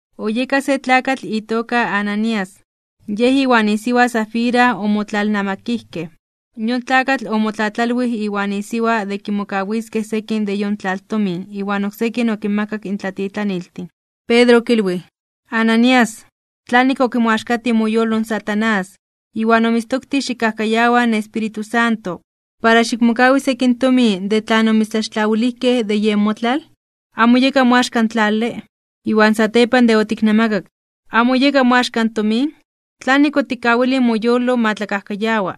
Oyeka se tlakatl itoka Ananías, yej iwan isiwa Safira omotlalnamakijkej. Yon tlakatl omotlatlalwij iwan isiwa de kimokawiskej sekin de yon tlaltomin iwan oksekin okinmakak in tlatitlaniltin. Pedro okilwij: ―Ananías, ¿tlanik okimoaxkatij moyolo in Satanás, iwan omitztoktij xikkajkayawa in Espíritu Santo, para xikmokawi sekin tomin de tlan omitztlaxtlawilijkej de yen motlal? ¿Amo oyeka moaxka in tlale? Iwan satepan de otiknamakak, ¿amo oyeka moaxka in tomin? ¿Tlanik otikkawilij moyolo ma tlakajkayawa?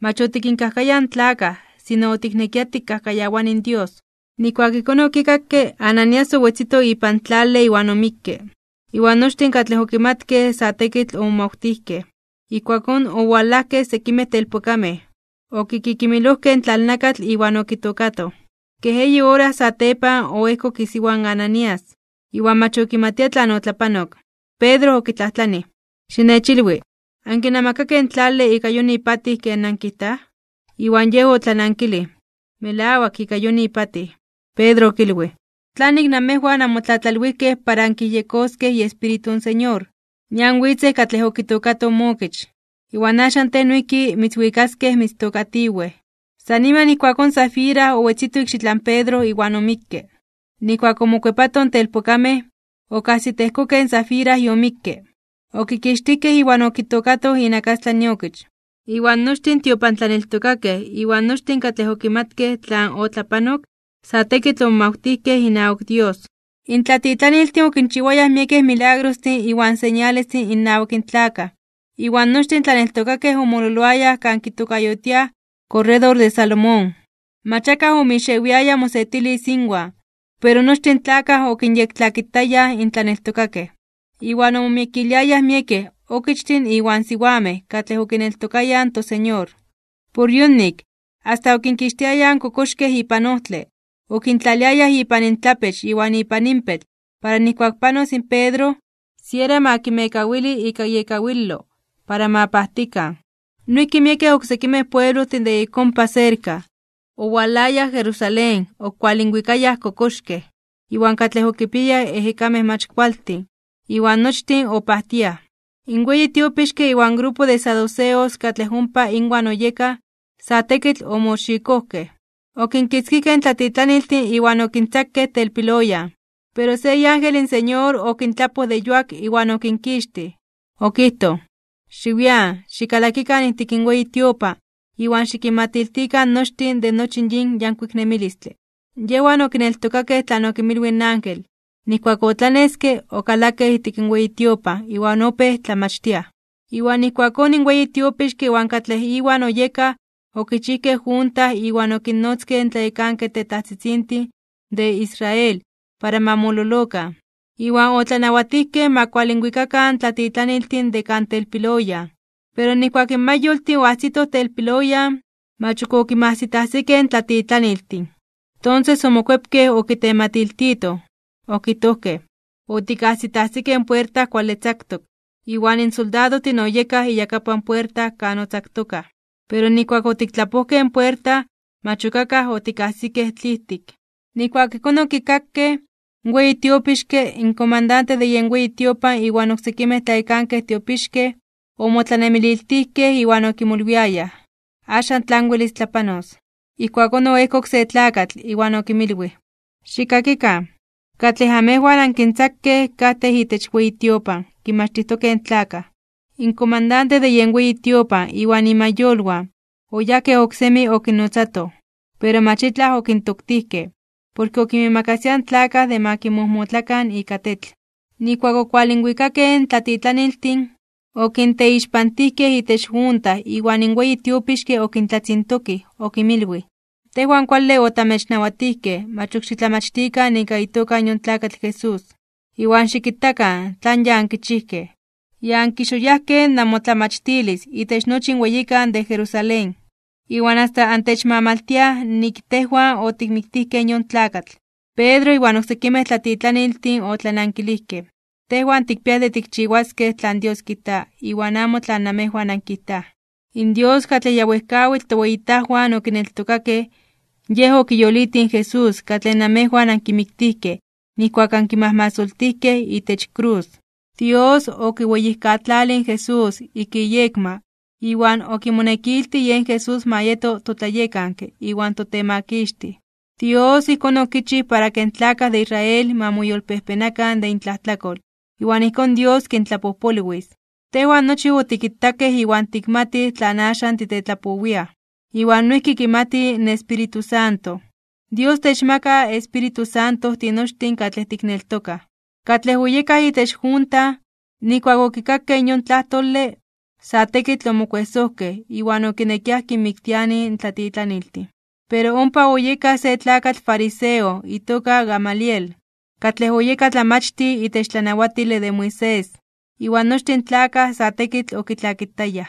Mach otikinkajkayaj in tlakaj, sino otiknekia tikajkayawani in Dios. Nijkuak ijkón okikakke, Ananías owetzito ipan tlale iwan omikke. Iwan nochtin katlej okimatkej sa tekitl omomawtijkej. Ijkuakón owalajkej sekimej telpokamej, okikimilojkej in tlalnakatl iwan okitookatoj. Kej eyi ora satepan oejkok isiwa in Ananías, iwan mach okimatia tlan otlapanok. Pedro okitlajtlanij: ―Xinechilwi, ¿ankinamakakej in tlale ika yon ipatij ken nankijtaj? Iwan yej otlanankilij: ―Melawak, ika yon ipatij. Pedro okilwij: ―¿Tlanik namejwan anmotlatlalwijkej para ankiyejyekoskej iEspíritu in Señor? Nian witzej katlej okitookatoj mookich, iwan axan tej noijki mitzwikaskej mitztookatiwej. San niman ijkuakón Safira owetzito ikxitlan Pedro iwan omikke. Nijkuak omokuepatoj in telpokamej, okajsitejkokej in Safira yomikke, okikixtijkej iwan okitookatoj inakastlan iokich. Iwan nochtin in tiopantlaneltokakej iwan nochtin katlej okimatkej tlan otlapanok, sa tekitl omomawtijkej inawak Dios. In tlatitlaniltin okinchiwayaj miekej milagrostin iwan señalestin innawak in tlakaj. Iwan nochtin in tlaneltokakej omololoayaj kan kitokayotiaj Korredor de Salomón. Mach akaj omixewiaya mosetilis inwan, pero nochtin in tlakaj okinyektlakitayaj in tlaneltokakej. Iwan omomiekiliayaj miekej okichtin iwan siwamej katlej okineltokayaj in toSeñor. Por yonik, asta okinkixtiayaj in kokoxkej ipan ojtle, okintlaliayaj ipan intlapech iwan inpan inpetl para nijkuak panos in Pedro, siera ma kinmekawili ika iekawilo para ma pajtikan. Noijki miekej oksekimej pueblojtin de ik ompa serka, owalayaj Jerusalén okualinwikayaj kokoxkej iwan katlej okipiayaj ejekamej mach kualtin, iwan nochtin opajtiaj. In weyi tiopixke iwan grupo de saduceos katlej ompa inwan oyekaj, sa tekitl omoxikojkej. Okinkitzkijkej in tlatitlaniltin iwan okintzakej telpiloyan. Pero se iángel in Señor okintlapoj de yuak iwan okinkixtij. Okijtoj: ―Xiwian. Xikalakikan ijtik in weyi tiopan iwan xikinmatiltikan nochtin de nochi yin yankuik nemilistle. Yejwan okineltokakej tlan okinmilwij in ángel. Nijkuak otlaneske, okalakej ijtik in weyi tiopan iwan opéj tlamachtiaj. Iwan ijkuakón in weyi tiopixke iwan katlej iwan oyekaj okichijkej junta iwan okinnotzkej in tlayekankej tetajtzitzintin de Israel para ma mololokan. Iwan otlanawatijkej ma kualinwikakan in tlatitlaniltin de kan telpiloyan. Pero nijkuak in mayoltin oajsitoj telpiloyan, mach ok okinmajsitajsikej in tlatitlaniltin. Tonses omokuepkej okitematiltitoj, okijtojkej: ―Otikajsitajsikej in puerta kuale tzaktok, iwan soldadojtin oyekaj iyakapan puerta kan otzaktokaj. Pero nijkuak otiktlapojkej in puerta, mach ok akaj otikajsikej tlijtik. Nijkuak ijkón okikakej, in weyi tiopixke, in komandante de weyi tiopan iwan oksekimej tlayekankej tiopixkej, omotlanemililtijkej iwan okimolwiayaj tlanon welis tlapanos satepan de yon tlamantle. Ijkuakón oejkok se tlakatl, iwan okinmilwij: ―Xikkakikan, katlej amejwan ankintzakej katej itech weyi tiopan kinmachtijtokej in tlakaj. In komandante de weyi tiopan iwan imayolwan, oyajkej oksemi okinnotzatoj, pero mach itlaj okintoktijkej, porke okinmiimakasiaj in tlakaj de ma kinmojmotlakan ika tetl. Nijkuak okualinwikakej in tlatitlaniltin, okinteixpantijkej itech junta iwan in weyi tiopixke okintlatzintokij okinmilwij: ―Tejwan kuale otamechnawatijkej mach ok xitlamachtikan ika itoka yon tlakatl Jesús. Iwan xikitakan tlan ya ankichijkej, ya ankixoyajkej (onkixitinijkej) namotlamachtilis itech nochi in weyikan de Jerusalén, iwan asta antechmamaltiaj nik tejwan otikmiktijkej yon tlakatl. Pedro iwan oksekimej tlatitlaniltin otlanankilijkej: ―Tejwan tikpiaj de tikchiwaskej tlan Dios kijta iwan amo tlan namejwan ankijtaj. In Dios katlej ya wejkawitl toweyitajwan okineltokakej Yej okiyolitij in Jesús katlej namejwan ankimiktijkej nijkuak ankimajmasoltijkej itech krus. Dios okiweyijkatlalij in Jesús ik iyekma iwan okimonekiltij yen Jesús ma yeto toTlayekanke iwan toTemakixtij. Dios ijkón okichij para ke in tlakaj de Israel ma moyolpejpenakan (ma moyolkuepakan) de intlajtlakol iwan ijkón Dios kintlapojpolwis. Tejwan nochi otikitakej iwan tikmatij tlan axan titetlapowiaj, iwan noijki kimati in Espíritu Santo. Dios techmaka in Espíritu Santo tinochtin katlej tikneltokaj. Katlej oyekaj itech junta, nijkuak okikakej in yon tlajtole, sa tekitl omokuejsojkej iwan okinekiaj kinmiktianij in tlatitlaniltin. Pero ompa oyeka se tlakatl fariseo itoka Gamaliel, katlej oyeka tlamachtij itech tlanawatile de Moisés, iwan nochtin in tlakaj sa tekitl okitlakitayaj.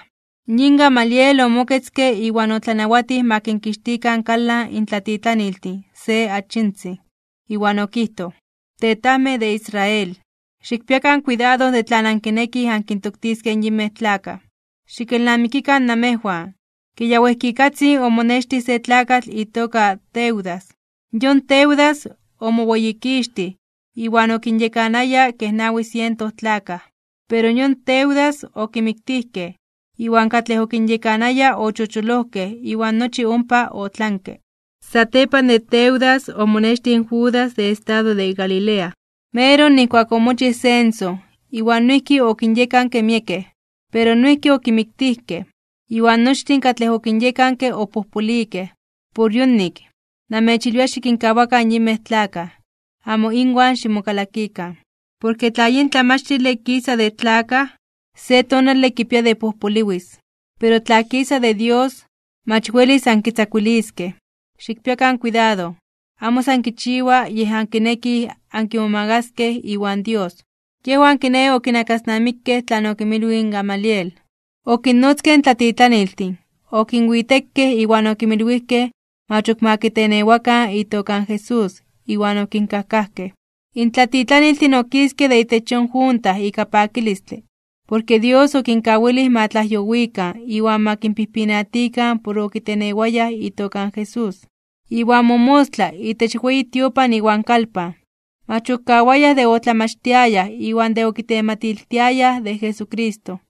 Yin Gamaliel omoketzke iwan otlanawatij ma kinkixtikan kalan in tlatitlaniltin se achitzin. Iwan okijtoj: ―Tetajmej de Israel, xikpiakan kuidado de tlan ankinekij ankintoktiskej in yinmej tlakaj. Xikelnamikikan namejwan, ke ya wejkikatzin omonextij se tlakatl itoka Teudas. Yon Teudas omoweyikixtij, iwan okinyekanaya kej nawi siento tlakaj. Pero yon Teudas okimiktijkej, iwan katlej okinyekanaya ochocholojkej iwan nochi ompa otlanke. Satepan de Teudas omonextij Judas de estado de Galilea, meroj nijkuak omochij censo, iwan noijki okinyekanke miekej, pero noijki okimiktijkej, iwan nochtin katlej okinyekanke opojpolikej. Por yonik, namechilwia xikinkawakan in yinmej tlakaj, amo inwan ximokalakikan. Porke tla yin tlamachtile kisa de tlakaj, se tonale kipia de pojpoliwis. Pero tla kisa de Dios, mach welis ankitzakuiliskej. Xikpiakan kuidado, amo san kichiwa yej ankinekij ankimomagaskej iwan Dios. Yejwan kiné okinakasnamikej tlan okinmilwij in Gamaliel. Okinnotzkej in tlatitlaniltin, okinwitekej iwan okinmilwijkej mach ok ma kitenewakan itoka in Jesús, iwan okinkajkajkej. In tlatitlaniltin okiskej de itech yon junta ika pakilistle, porke Dios okinkawilij ma tlajyowikan iwan ma kinpijpinatikan por okitenewayaj itoka in Jesús. Iwan momostla itech weyi tiopan iwan kalpan, mach okawayaj de otlamachtiayaj iwan de okitematiltiayaj de Jesucristo.